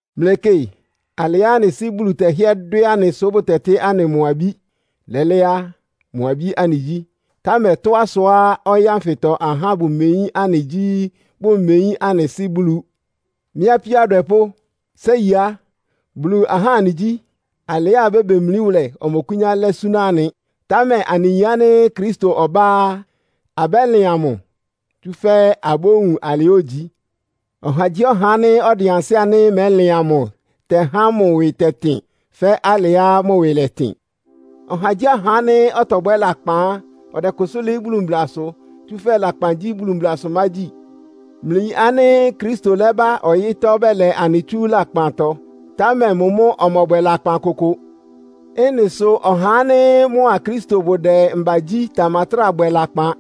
Mlɩkɩ alɩá anɩ Sɩ́ Bulu tɛhɩ́ɛ́ dwɛ́ anɩ sʋ́ bʋtɛtɩ́ anɩ mʋ abí. Lɛ́lɛ́ á, mʋ abí anɩgyí. Támɛ tɔ́á sʋá ɔyɩ́ ánfɩtɔ ahá bʋmeyín anɩ gyí, bʋmeyín anɩ Sɩ́ Bulu. Mɩ́ apíó adwɛpʋ́, séi á, Bulu ahá anɩgyí. Alɩá abébemlí wʋlɛ ɔmɔkʋ́nyá lɛ́ súná anɩ. Támɛ anɩyin ánɩ́ Kristo ɔbá á, abɛ́lɩan mʋ, tsúfɛ́ abówun alɩá ogyi. Ɔhagyíɔha ánɩ́ ɔdɩn ansɩ́ ánɩ́ mɛ́lɩan mʋ tɛhá mʋ ɩwɩ tɛtɩn, fɛ́ alɩá mʋ ɩwɩ lɛtɩn. Ɔhagyíɔha ánɩ́ ɔtɔbwɛ́ lakpan á, ɔdɛkʋsʋ́ lɩ́ɩ́ Bulu mblasʋ. Tsúfɛ́ lakpan gyí Bulu mblasʋmágyi. Mlɩyin ánɩ́ Kristo lɛ́ba ɔyɩ́tɔ́ bɛlɛ anɩ tsú anɩ lakpantɔ, támɛ mʋ mʋ́ ɔmɔbwɛ lakpan kʋkʋ. Ɩ́nɩ sʋ ɔhá ánɩ́ mʋa Kristo bʋdɛ mbagyí tamatráa bwɛ lakpan.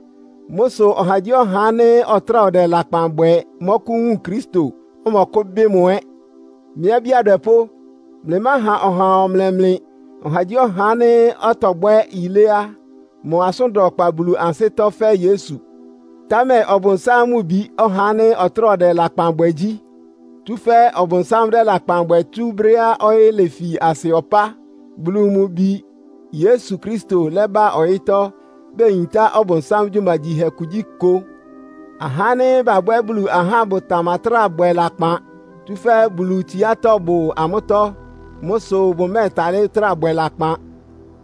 Mʋ́ sʋ ɔhagyíɔha ánɩ́ ɔtráa ɔdɛ lakpan bwɛ mɔ́kʋ́wun Kristo, ɔmɔkʋ́bɩ́ mʋ ɛ́. Mɩ́ abí adwɛpʋ́, mlɩmáha ɔhaa ɔmlɛ mlɩ. Ɔhagyíɔha ánɩ́ ɔtɔbwɛ́ yilé á, mʋ asʋ́n da ɔkpa Bulu ansɩ́tɔ́ fɛ́ Yesu. Támɛ Ɔbʋnsám mʋ bi, ɔhá ánɩ́ ɔtráa ɔdɛ lakpan bwɛ gyí. Tsúfɛ́ Ɔbʋnsám dɛ́ lakpan bwɛ tsú brɛ́á ɔyɩ́ lefi asɩ ɔpá. Bulu mʋ Bi Yesu Kristo lɛ́ba ɔyɩ́tɔ́ beyintá Ɔbʋnsám gyumagyihɛ kugyíkʋ. Ahá ánɩ́ babwɛ́ Bulu ahá bʋtamatráa bwɛ lakpan, tsúfɛ́ Bulu tsiátɔ́ bʋ amʋ́tɔ́. Mʋ́ sʋ bʋmɛ́ɛtalɩ́ trá bwɛ lakpan.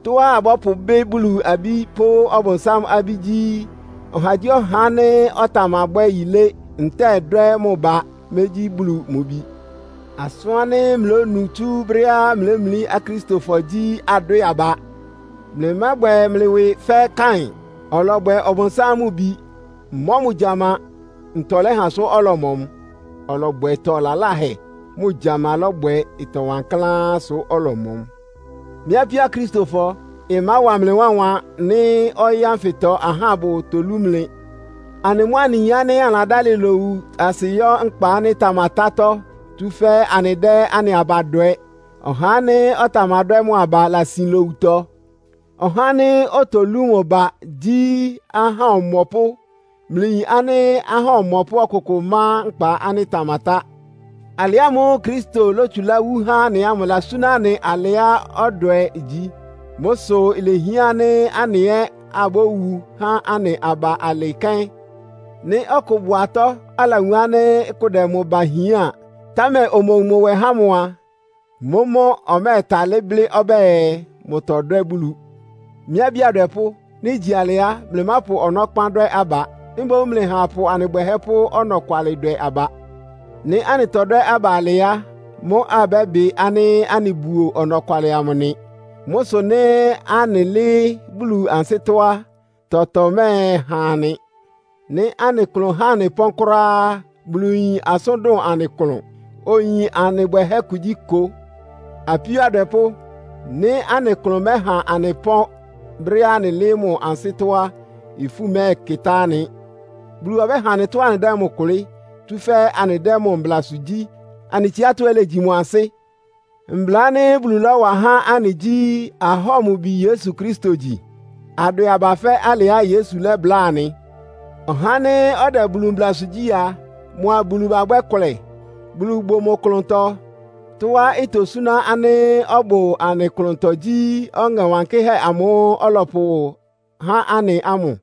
Tɔ́á abɔ́pʋbɩ́ Bulu abí pʋ́ Ɔbʋnsám abí gyí, ɔhagyíɔha ánɩ́ ɔtamabwɛ́ yilé, ntɛ́ɛ dwɛ́ mʋ ba mégyí Bulu mʋ bi. Asʋ́n ánɩ́ mlɩlónu tsú brɛ́á mlɩlémlí Akristofɔ gyí, adwɛ́ɛ aba. Mlɩmábwɛ mlɩ ɩwɩ fɛ́ Kain. Ɔlɔbwɛ Ɔbʋnsám mʋ bi, mɔ́ mʋ gyama. Ntɔ lɛ́ha sʋ́ ɔlɔmɔ mʋ? Ɔlɔbwɛ ɩtɔ laláhɛ, mʋ gyama mʋ́ lɔ́bwɛ ɩtɔ wankláán sʋ ɔlɔmɔ mʋ. Mɩ́ apíó Akristofɔ, ɩmáwa mlɩ wánwan nɩ́ ɔyɩ́ ánfɩtɔ ahá bʋtolú mlɩ. Anɩ mʋ́ anɩyin ánɩ́ anɩladálɩ lowu asɩ yɔ́ nkpa ánɩ́ ɩtamatátɔ́, tsúfɛ́ anɩdɛ́ anɩ aba dwɛ. Ɔhá ánɩ́ ɔtamadwɛ́ mʋ aba lasin lowutɔ. Ɔhá ánɩ́ otolú mʋ ba gyí ahá ɔmɔpʋ́. Mlɩyin ánɩ́ ahá ɔmɔpʋ́ ɔkʋkʋ má nkpa ánɩ́ ɩtamatá. Alɩ ámʋ́ʋ́ Kristo lótsulá wú há anɩ ámʋ ɩlasúná anɩ alɩá ɔdwɛ gyí. Mʋ́ sʋ ilehián ánɩ́ anɩ ɛ́ abówu há anɩ aba alɩ kɛ́n. Nɩ́ ɔkʋ bʋ atɔ́, alawun ánɩ́ kʋ dɛ mʋ ba hián, támɛ omowun mʋ nwɛ há mʋ a, mʋ́mʋ́ ɔmɛ́ɛtalɩ́ blɩ́ ɔbɛ́ɛ, mʋtɔdwɛ́ Bulu. Mɩ́ abí adwɛpʋ́, nɩ́ igyi alɩ á, mlɩmápʋ ɔnɔ́kpán dwɛ́ aba. Mboún mlɩha apʋ anɩ bwɛhɛ́ pʋ́ ɔnɔkwalɩ dwɛ aba. Nɩ́ anɩtɔdwɛ́ aba alɩ á, mʋ́ abɛ́bɩ ánɩ́ anɩbuo ɔnɔkwalɩ amʋ nɩ. Mʋ́ sʋ nɩ́ anɩlɩ́ɩ́ Bulu ansɩ́tɔ́ á, tɔtɔ mɛ́ɛhan anɩ. Nɩ́ anɩ klʋn ɩhá anɩ pɔ́n kʋ́ráá á, Bulu yin asʋ́n dʋn anɩ klʋn, oyin anɩ bwɛhɛ́ kugyíkʋ. Apíó adwɛpʋ́, nɩ́ anɩ klʋn mɛ́ha anɩ pɔ́n brɛ́á anɩlɩ́ɩ́ mʋ ansɩ́tɔ́ á, ifú mɛ́ɛkɩtá anɩ. Bulu ɔbɛ́ha anɩ tɔ́á anɩdɛ́ mʋ kʋlɩ́, tsúfɛ́ anɩdɛ́ mʋ mblasʋ gyí, anɩ tsiátɔ́ ɛ́ légyi mʋ ansɩ́. Mbla ánɩ́ Bulu lɔ́wa há anɩ gyí, ahɔ́ɔ mʋ Bi Yesu Kristo gyi, adwɛ aba fɛ́ alɩá Yesu lɛ́bláa anɩ. Ɔhá ánɩ́ ɔdɛ Bulu mblasʋ gyí a, mʋa Bulu babwɛ́ kʋlɛ. Bulu bʋ mʋ klʋntɔ. Tɔ́á itosúná anɩ ánɩ́ ɔbʋ anɩ klʋntɔ gyí Ɔŋɛ Wankɩ́hɛ́ amʋ́ʋ́ ɔlɔpʋhá anɩ ámʋ.